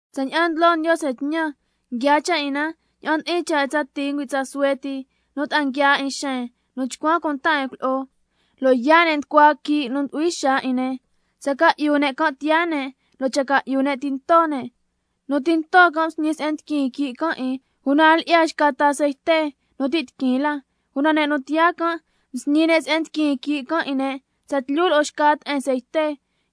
Tsaña'an ndlo Ndiose tñan, nguiaa cha' 'in na ña'an ndi'in cha' 'in tsa tii ngüi' tsa suhue ti, nu ta'a nguiaa 'in xen nu chcuan cunta 'in cuilyi'o, lo' yaa' ne' nducua quii' nu ndu'hui xaa 'in ne'. Tsa ca'yu ne' can' tiyaa ne', lo' cha ca'yu ne' tinto ne'. Nu tinto can' msñi se'en ndiquin quii' can' 'in, una a lyi'ya xca ta ceite nu ti' tiquin la. Una ne' nu tiyaa can', msñi ne' se'en ndiquin quii' can' 'in ne' tsatlyu lo'o xca te'en ceite.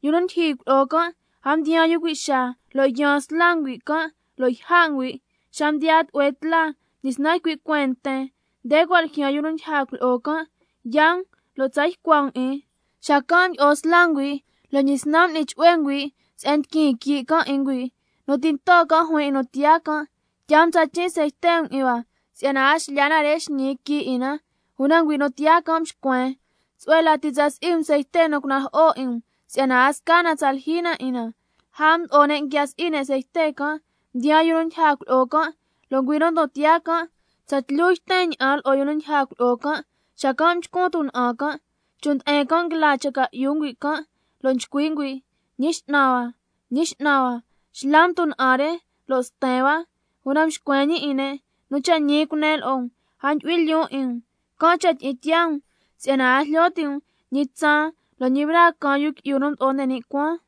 Yu nu ndyijyi cuilyi'o can' a mdiyaan yu cui' xaa, lo' mdyisnan yaan sla ngüi' can', lo' yja' ngüi'. Xa mdiyaa tlu'hue tla mdyisnan ycui' cueen nten can' lo' nchcui' ne': Nde cua' ljyaan yu nu ndyija cuilyi'o can', yaa um lo' tsa tucua um 'in. Xacan' mdyi'o sla ngüi', lo' mdyisnan m'ni chu'hue ngüi' se'en ndiquin quii' can' 'in ngüi'. Nu tinto can' juin 'in nu tiyaa can': Tyaa um tsachin' ceite 'in hua si'yana a xlyaa na re xñi quii' 'in na. Una ngüi' nu tiyaa can' mxcuen: Tsu'hue lati tsa si'i um ceite nu cunajo'o 'in um, si'yana a sca na tsa lyijyi na 'in na. Lja mdo'o ne' nguia si'i ne' ceite can', mdiyaan yu nu ndyija cuilyi'o can', lo' ngüi' nu cua' ndon tiyaa can' tsatlyu yten ña'an lo'o yu nu ndyija cuilyi'o can', xacan' mchcun tuna'an can'. Chon' nde'en can' nguila cha ca'yu ngüi' can', lo' nchcui' ngüi': ¡Ñi X'nan hua, Ñi X'nan hua, xla um tuna'an re lo' sten hua! Una mxcuen ñi 'in ne': Nu cha' ñi cunen lo'o um, a ndyu'hui lyoon 'in um. Can' cha' tyi'in tiyaa um, si'yana a jlyo ti' um ñi tsaan lo' ñi braa caan Yu Qui'yu nu Mdo'o nde ni' Cuaan.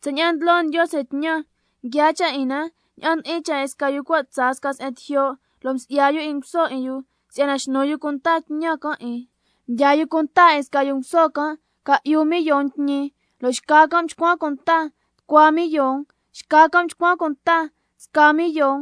Tsaña'an ndlo Ndiose tñan, nguiaa cha' 'in na ña'an ndi'in cha' 'in sca yu cua' tsaa sca se'en tijyo', lo' msi'ya yu nguso 'in yu si'yana xnu yu cunta tñan can' 'in. Mdyaa yu cunta 'in sca yu nguso can' ca'yu millon tñi, lo' xca can' mchcuan cunta tucua millon, xca can' mchcuan cunta sca millon,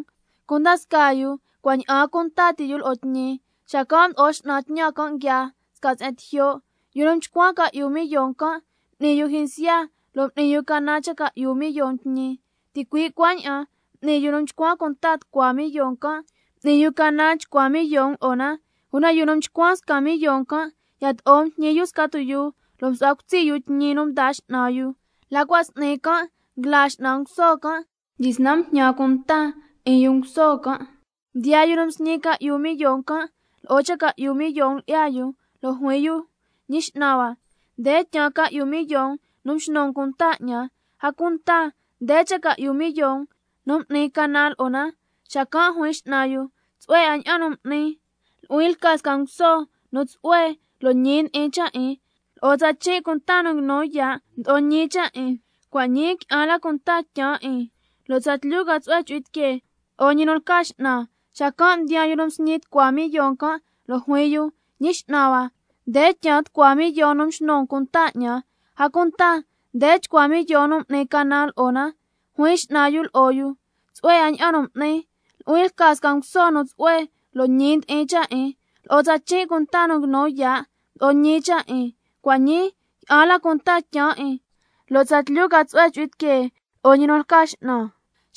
cunda scaa yu cua' ña'aan cunta ti' yu lo'o tñi. Xacan' mdo'o x'nan tñan can', nguiaa sca se'en tijyo'. Yu nu mchcuan ca'yu millon can', m'ni yu jyinsya lo' m'ni yu canan cha ca'yu millon tñi. Ticui' cuaña'an m'ni yu nu mchcuan cunta tucua millon can', m'ni yu canan chcua millon lo'o na. Una yu nu mchcuan sca millon can', yato'o mjñi yu sca tuyuu lo' msu'hua cutsi' yu tñi nu mdaa x'nan yu. La cua' s'ni can' nguila x'nan nguso can', mdyisnan mjñan cunta 'in yu nguso can'. Mdiyaa yu nu msñi ca'yu millon can', lo'o cha ca'yu millon lyi'ya yu, lo' juin yu: Ñi x'nan hua, nde tyaan ca'yu millon nu mxnu um cunta 'ñan, a cunta nde cha ca'yu millon nu m'nin canan lo'o na. Xacan' juin x'nan yu: Tsu'hue 'a ña'an nu m'ni, nu'huin lca sca nguso nu tsu'hue lo' ñi ndi'in cha' 'in. Lo'o tsachin' cunta nu nguinu yaa' mdo'o ñi cha' 'in, cua' ñii qui'an la cunta tyaan 'in, lo' tsatlyu ca tsu'hue chu'hui tiquee lo'o ñi nu lca x'nan. Xacan' mdiyaa yu nu msñi tucua millon can', lo' juin yu: Ñi x'nan hua, nde tyaan tucua millon nu mxnu um cunta 'ñan, a cunta nde chcua millon nu m'nin canan lo'o na. Juin x'nan yu lo'o yu: Tsu'hue 'a ña'an nu m'ni, nu'huin lca sca nguso nu tsu'hue lo' ñi ndi'in cha' 'in. Lo'o tsachin' cunta nu nguinu yaa' mdo'o ñi cha' 'in, cua' ñii qui'an la cunta tyaan 'in, lo' tsatlyu ca tsu'hue chu'hui tiquee lo'o ñi nu lca x'nan.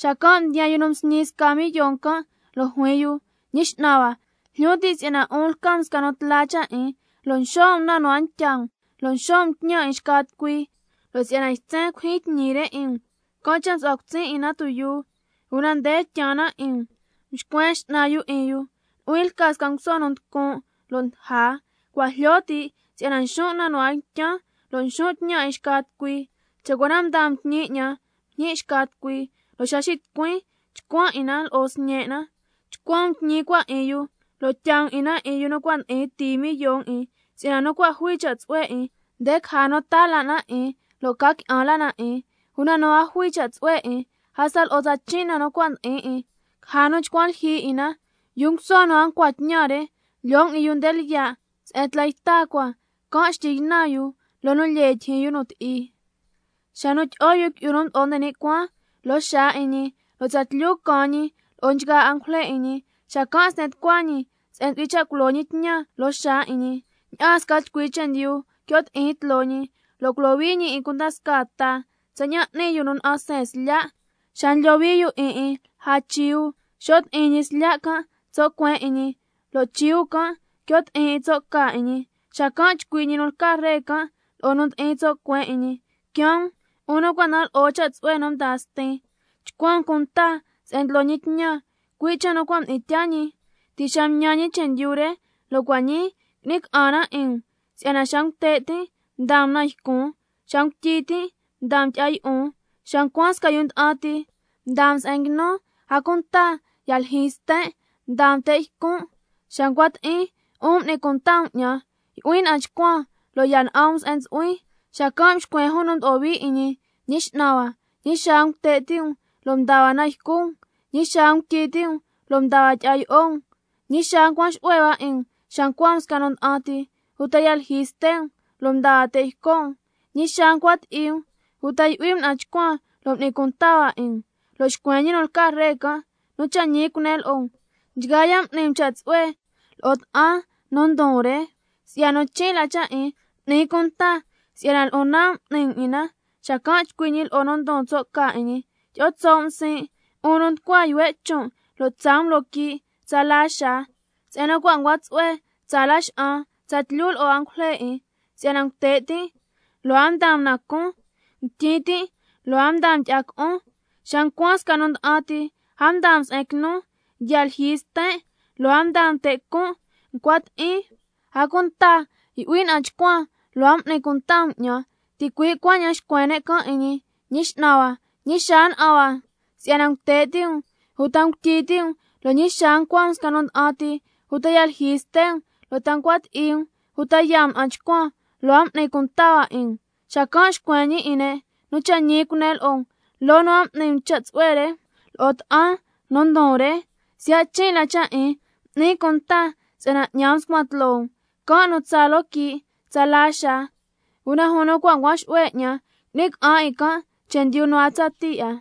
Xacan' mdiyaa yu nu msñi sca millon can', lo' juin yu: Ñi x'nan hua, jlyo tin' si'yana 'un lca um sca nu tla cha' 'in, lo' nxo' um na nu a ntya um, lo' nxo' um tñan 'in xca tucui, lo' si'yana ytsen culyijyin tñi re 'in um, can' cha' msu'huan cutsin' 'in na tuyuu, una nde tyaan na 'in um. Mxcuen x'nan yu 'in yu: Nu'huin lca sca nguso nu nducun' lo' ndaja, cua' jlyo ti' si'yana nxon' na nu a ntyan, lo' nxon' tñan 'in xca tucui. Cha' cua na mdaa um tñi 'ñan mjñi' xca tucui, lo' xa xitucuin chcuan 'in na lo'o sñe' na. Chcuan um tñi cua 'in yu, lo' tyaa um 'in na 'in yu nu cua' ndi'in tii millon 'in. Si'yana nu cua' jui cha' tsu'hue 'in, nde caja nu taa la na 'in lo' ca qui'an la na 'in, una nu a jui cha' tsu'hue 'in, hasta lo'o tsachin' na nu cua' ndi'in 'in, caja nu chcuan lyijyi 'in na. Yu nguso nu a ncua tñan re, lyoo um 'in yu nde lyiya' se'en tla yta cua, can' xtyi ynan yu loo nu lyee tyijyin yu nu ti'i. Xa nu tyi'o Yu Qui'yu nu Mdo'o nde ni' Cuaan loo xaa 'in ñi, lo' tsatlyu caan ñi lo'o nchgaa angujle 'in ñi, xacan' sten tucua ñi se'en ntsu'hui cha' culo ñi tñan loo xaa 'in ñi, ña'aan sca chcui chendyu quio' ti'in tloo ñi, lo' culohui ñi 'in cunda scaa ta, tsaña'an n'ni yu nu na'an seen slya' xa ndlohui yu 'in 'in lja chiu. Xo' ti'in ñi slya' can' tso' cueen 'in ñi, lo' chiu can' quio' ti'in tso' ca 'in ñi. Xacan' chcui' ñi nu lca Ree can' lo'o nu ndi'in tso' cueen 'in ñi: Quiaan um, 'un nu cua' nda'an lo'o cha' tsu'hue nu mdaa Stin, chcuan um cunta se'en ndlo ñi tñan, cui' cha' nu cua' mdi'in tyaa ñi ti' xa mtñan ñi chendyu re, lo' cua' ñi qui'ni ca'an na 'in um. Si'yana xa ngute' tin' mdaa um na ycun, xa ngutyi tin' mdaa um tyi'a yi'on, xa ncuan sca yu nda'an ti mdaa um se'en nguinun. A cunta ya lyijyi sten' mdaa um te' ycon', xa ncua ti'in 'un m'ni cunta um 'ñan, yu'huin na'an chcuan lo' ya na'an um se'en ntsu'huin. Xacan' xcuen jun nu mdo'o hui 'in ñi: ¿Ñi X'nan hua, ñi xaa ngute' ti' um lo' mdaa hua na ycu um, ñi xaa ngutyi ti' um lo' mdaa hua tyi'a yi'o um? ¿Ñi xaa ncuan xu'hue hua 'in um xa ncua um sca nu nda'an ti, uta ya lyijyi ste' um lo' mdaa hua te' yco' um? ¿Ñi xaa ncua ti'i um, uta yu'hui um na'an chcuan lo' m'ni cunta hua 'in um? Lo' xcuen ñi nu lca Ree can': Nu cha' ñi cunen lo'o um, nchgaa ya' m'ni um cha' tsu'hue lo'o ta'an nu ndon re, siya' nu chin' la cha' 'in, m'nin cunta si'yana lo'on nan' m'ni um 'in na. Xacan' chcui' ñi lo'o nu ndi'in tso' ca 'in ñi: Tyi'o tso' um siin', 'un nu nducua yuhue' chon' lo' tsaa um loo quii' tsala xaa, se'en nu cua' ncua tsu'hue tsaa laxa'an tsatlyu lo'o angujle 'in. Si'yana ngute' tin' lo' a mdaa um na cun, ngutyi tin' lo' a mdaa um tyi'a co'on. Xa ncuan sca nu nda'an ti, a mdaa um se'en quinun, ya lyijyi sten' lo' a mdaa um te' con', ncua ti'in, a cunta yu'huin na'an chcuan lo' a m'ni cunta um 'ñan. Ticui' cuaña'an xcuen ne' can' 'in ñi: Ñi X'nan hua, ¿ñi xaa na'an hua si'yana ngute' ti' um, uta ngutyi ti' um, lo' ñi xaa ncua um sca nu nda'an ti, uta ya lyijyi ste' um, lo' ta ncua ti'i um uta yaa um na'an chcuan, lo' a m'ni cunta hua 'in um? Xacan' xcuen ñi 'in ne': Nu cha' ñi cunen lo'o um, loo nu a m'ni um cha' tsu'hue re lo'o ta'an nu ndon re, siya' chin' la cha' 'in, m'nin cunta si'yana 'ñan mscuan tloo um. Can' nu tsaa loo quii' tsala xaa, una jun nu cua' ncuan xu'hue 'ñan, qui'ni ca'an 'in can' chendyu nu a tsatii 'a.